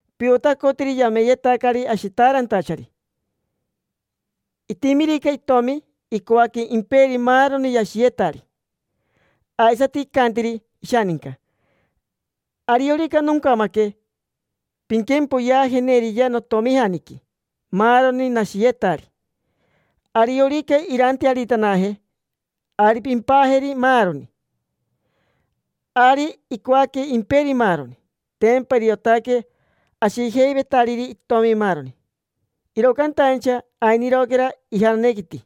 Piotacotiri yameyetacari ashitaarantachari. Itimirica itomi, icoaque imperi maaroni yashiyetari. Aisati icantiri ishaninca: “Ariorica noncamaque, pinquempoyeajeneriya notomijaniqui maaroni nashiyetari. Ariorica irantearitanaje, ari pimpajeri maaroni”. Ari icoaque imperi maaroni; tempa iriotaque ashijeivetariri itomi maaroni, iro cantaincha ainiroquera ijananequiti,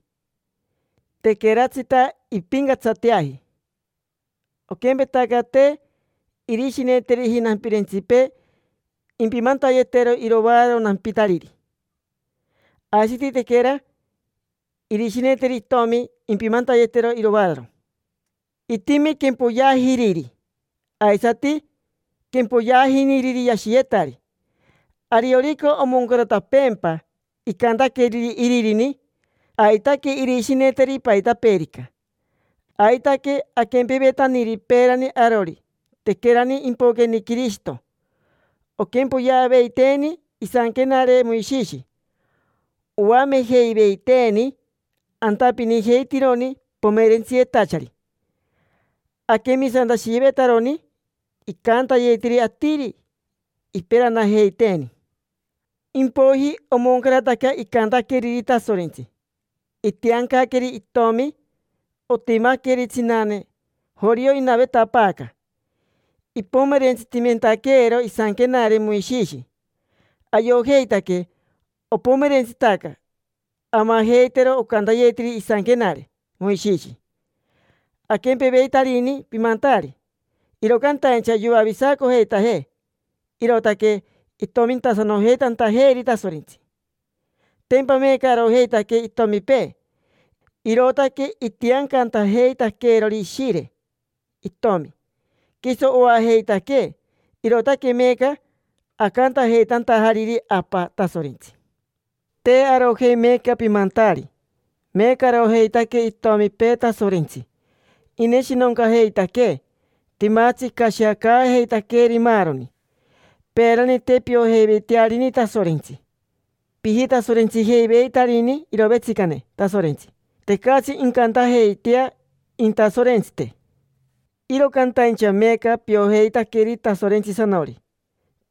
tequeratsita impincatsateaji. Oquempetaca te irishineteriji nampirentsipee impimantayetero iroaararo nampitariri, aisati tequera irishineteri itomi impimantayetero iroaararo. Itimi quempoyeajiriri, aisati quempoyeajiniriri yashiyetari. Ariorica omoncaratapeempa icantaqueriri iririni, aitaque irishineteri paitapeerica. Aitaque aquempevetaniri peerani arori, tequerani impoqueni Quirishito. Oquempoyeaveiteeni isanquenare Moishishi, oamejeiveiteeni antapinijeitironi pomerentsiyetachari. Aquemisantashiyevetaroni icantayetiri atiri, iperanajeiteeni. Impoiji omoncarataca icantaqueriri Tasorentsi. Itiancaqueri itomi, otimaqueri tsinane, jorio inavetapaaca, ipomerentsitimentaquero isanquenare Moishishi. Ayojeitaque opomerentsitaca amajeitero ocantayetiri isanquenare Moishishi. Aquempeveitarini pimantaari, iro cantaincha yoavisacojeitajee, irootaque itomintasanojeitantajeeri Tasorentsi. Tempa meeca arojeitaque itomipee, irootaque itiancantajeitaqueerori Ishire Itomi, quiso oajeitaquee. Irootaque meeca acantajeitantajariri: “Apa Tasorentsi”. Te arojei meeca pimantaari, meeca arojeitaque itomipee Tasorentsi. Ineshinoncajeitaquee, timatsi icashiacaajeitaqueeri maaroni. Peerani, te piojeiveitearini Tasorentsi, pijitasorentsijeiveitarini irovetsicane Tasorentsi. Tecatsi incantajeitea intasorentsite. Iro cantaincha meeca piojeitaqueri Tasorentsisanori,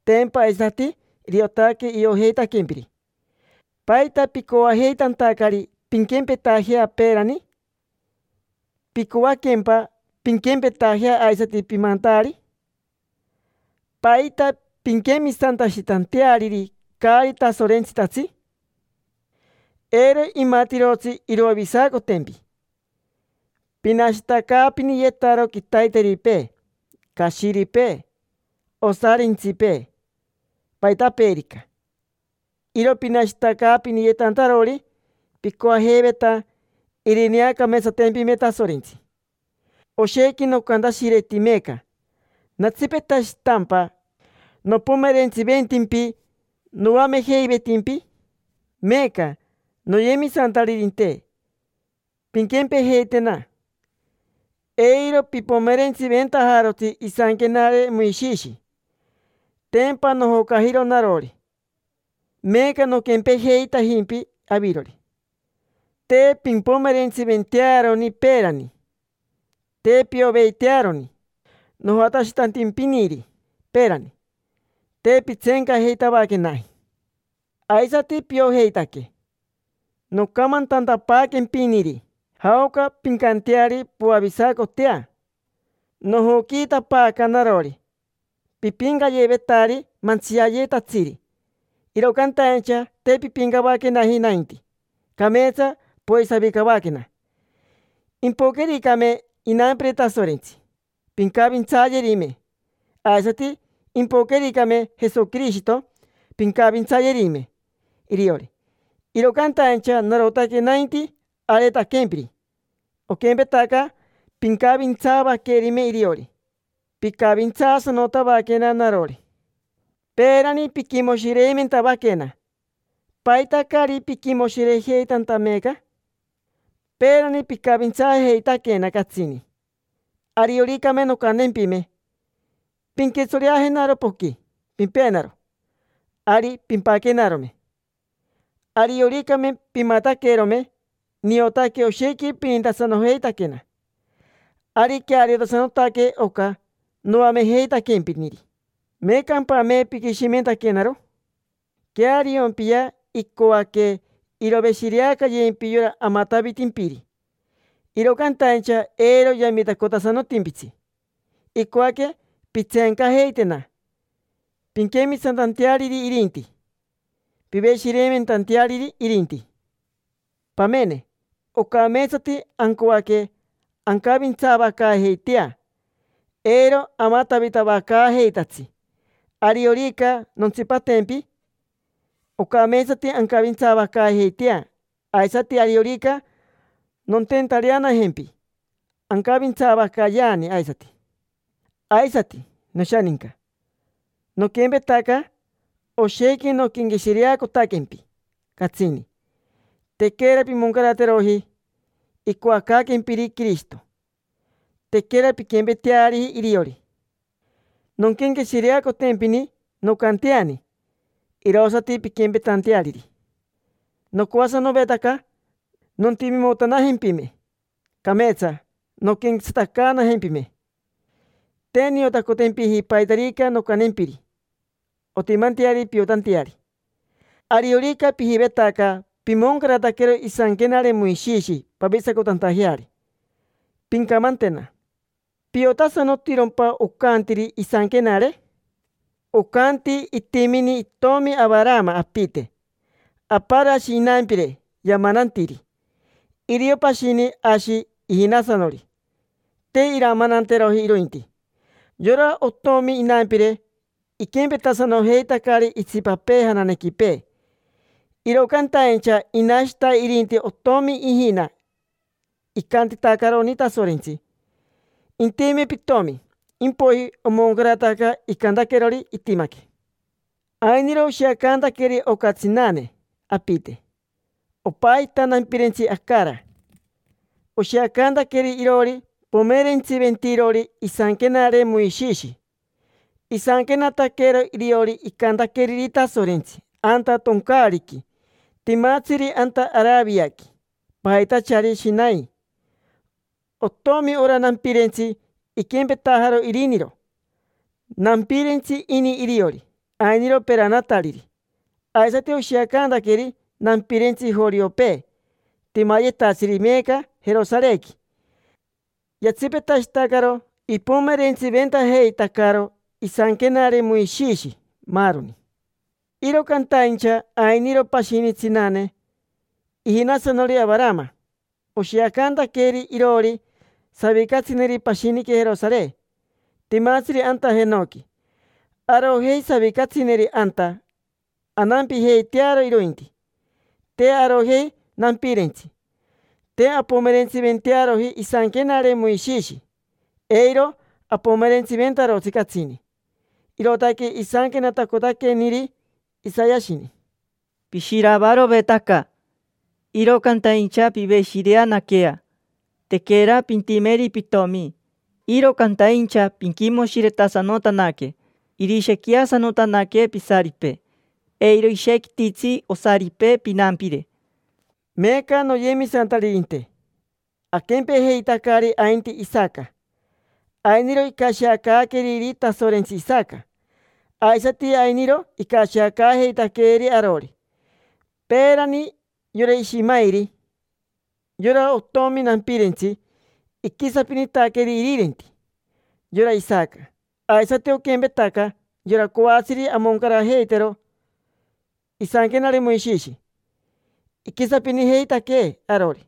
tempa aisati iriotaque iojeitaquempiri. ¿Paita picoajeitantacari pinquempetajea peerani? ¿Picoaquempa pinquempetajea aisati pimantaari? ¿Paita pinquemisantashitanteariri caari tasorentsitatsi? Eiro imatirotsi iroavisacotempi. Pinashitacaapiniyetaro quitaiteripee, cashiripee, osarintsipee, paitapeerica. Iro pinashitacaapiniyetantarori picoajeiveta irineacameetsatempime Tasorentsi. Oshequi nocantashireti meeca. ¿Natsipetashitampa nopomerentsiventimpi noamejeivetimpi? Meeca, noyemisantaririnte, pinquempejeitena: eiro pipomerentsiventajarotsi isanquenare Moishishi. Tempa nojocajiro narori, meeca noquempejeitajimpi avirori, te pimpomerentsiventearoni peerani, te pioveitearoni. Nojatashitantimpiniri peerani, te pintseencajeitavaquenaji. Aisati piojeitaque nocamantantapaaquempiniri jaoca pincanteari poavisacotea, nojoquiitapaaca narori. Pipincayevetari mantsiayetatsiri, iro cantaincha te pimpincavaquenaji nainti, cameetsa poisavicavaquena. Impoquericame inampire Tasorentsi, pincavintsayerime; aisati impoquericame Jesoquirishito, pincavintsayerime iriori. Iro cantaincha narotaque nainti areetaquempiri. Oquempetaca pincavintsaavaquerime iriori, picavintsaasanotavaquena narori. Peerani piquimoshireimentavaquena, ¿paita caari piquimoshirejeitanta meeca? Peerani picavintsaajeitaquena catsini. Arioricame noncantempime: “Pinquitsoreajenaro poqui, pimpenaro”, ari pimpaquenarome, arioricame pimataquerome. Niotaque oshequi pinintasanojeitaquena. Ari queariosanotaque oca noamejeitaquempiniri, ¿meecampame piquishimentaquenaro? Queariompia: icoaque iroveshireacayempi yora amatavitimpiri, iro cantaincha eiro yamitacotasanotimpitsi. Icoaque pintseencajeitena, pinquemisantanteariri irinti, piveshireimentanteariri irinti. Pamene, ocameetsati ancoaque ancavintsaavacaajeitea, eiro amatavitavacaajeitatsi. Ariorica nontsipatempi, ocameetsati ancavintsaavacaajeitea, aisati ariorica nonteentareanajempi, ancavintsaavacayeani aisati. Aisati, noshaninca, noquempetaca: oshequi noquenqueshireacotaquempi catsini, tequera pimoncarateroji icoacaaquempiri Quirishito, tequera pinquempeteari iriori. Nonquenqueshireacotempini, noncanteani, irosati pinquempetanteariri. Nocoasanovetaca nontimimotanajempime, cameetsa nonquenquetsatacaanajempime. Te niotacotempiji paitarica noncantempiri ontimanteari piotanteari. Ariorica pijivetaca pimoncarataquero isanquenare Moishishi pavisacotantajeari, pincamantena: ¿piotasanotirompa ocantiri isanquenare? Ocanti itimini itomi Avarama apite. Aparo ashi inampire yamanantiri. Irio pashini ashi ijinasanori, te iramananteroji irointi. Yora otomi inampire iquempetasanojeitacari itsipapee jananequipee. Iro cantaincha inashita irinti otomi ijina. Icantitacaroni Tasorentsi: “Intime pitomi”. Impoiji omoncarataca icantaquerori, itimaque. Ainiro oshiacantaqueri oca tsinane apite. Opajita nampirentsi Acara. Oshiacantaqueri iroori pomerentsiventirori isanquenare Moishishi. Isanquenataquero iriori icantaqueriri Tasorentsi anta toncaariqui timatsiri anta Araviaqui, pajitachari Shinai. Otomi ora nampirentsi, iquempetajaro iriniro: nampirentsi ini iriori, ainiro peranatariri. Aisati oshiacantaqueri nampirentsi joriopee timayetatsiri meeca Jerosarequi: yatsipetashitacaro ipomerentsiventajeitacaro isanquenare Moishishi, maaroni. Iro cantaincha ainiro pashini tsinane: ijinasanori Avarama. Oshiacantaqueri iroori savicatsineri pashiniqui Jerosare, timatsiri anta jenoqui. Arojei savicatsineri anta, anampijeitearo irointi. Te arojei nampirentsi, te ampomerentsiventearoji isanquenare Moishishi, eiro apomerentsiventarotsi catsini. Irootaque isanquenatacotaqueniri Isayashini: “Pishiravarovetaca, iro cantaincha piveshireanaquea. Tequera pintimeri pitomi, iro cantaincha pinquimoshiretasanotanaque, irishequiasanotanaque pisaripee, eiro ishequititsi osaripee pinampire”. Meeca, noyemisantaririnte, aquempejeitacari ainti Isaca. Ainiro icashiacaaqueriri Tasorentsi Isaca, aisati ainiro icashiacaajeitaqueeri arori. Peerani, yora Ishimairi, yora otomi nampirentsi, iquisapinitaqueri irirenti: yora Isaca. Aisati oquempetaca, yora coatsiri amoncarajeitero isanquenare Moishishi iquisapinijeitaquee arori: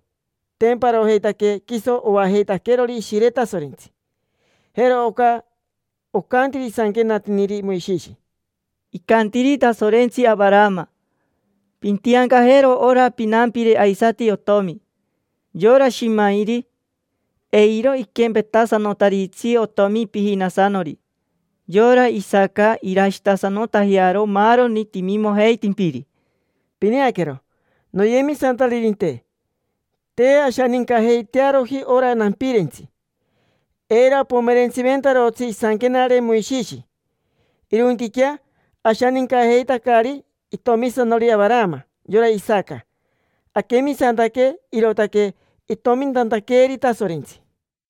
tempa arojeitaque quiso oajeitaquerori Ishire Tasorentsi. Jero oca ocantiri isanquenatiniri Moishishi: “Icantiri Tasorentsi Avarama: ‘Pintiancajero ora pinampire aisati otomi. Yora Ishimairi, eiro iquempetasanotaritsi otomi pijinasanori. Yora Isaca irashitasanotajearo maaroni timimojeitimpiri’”. Pineaquero, noyemisantaririnte, te ashanincajeitearoji ora nampirentsi, eiro apomerentsiventarotsi isanquenare Moishishi. Irointiquea ashanincajeitacari itomisanori Avarama: yora Isaca. Aquemisantaque, irootaque itomintantaqueeri Tasorentsi.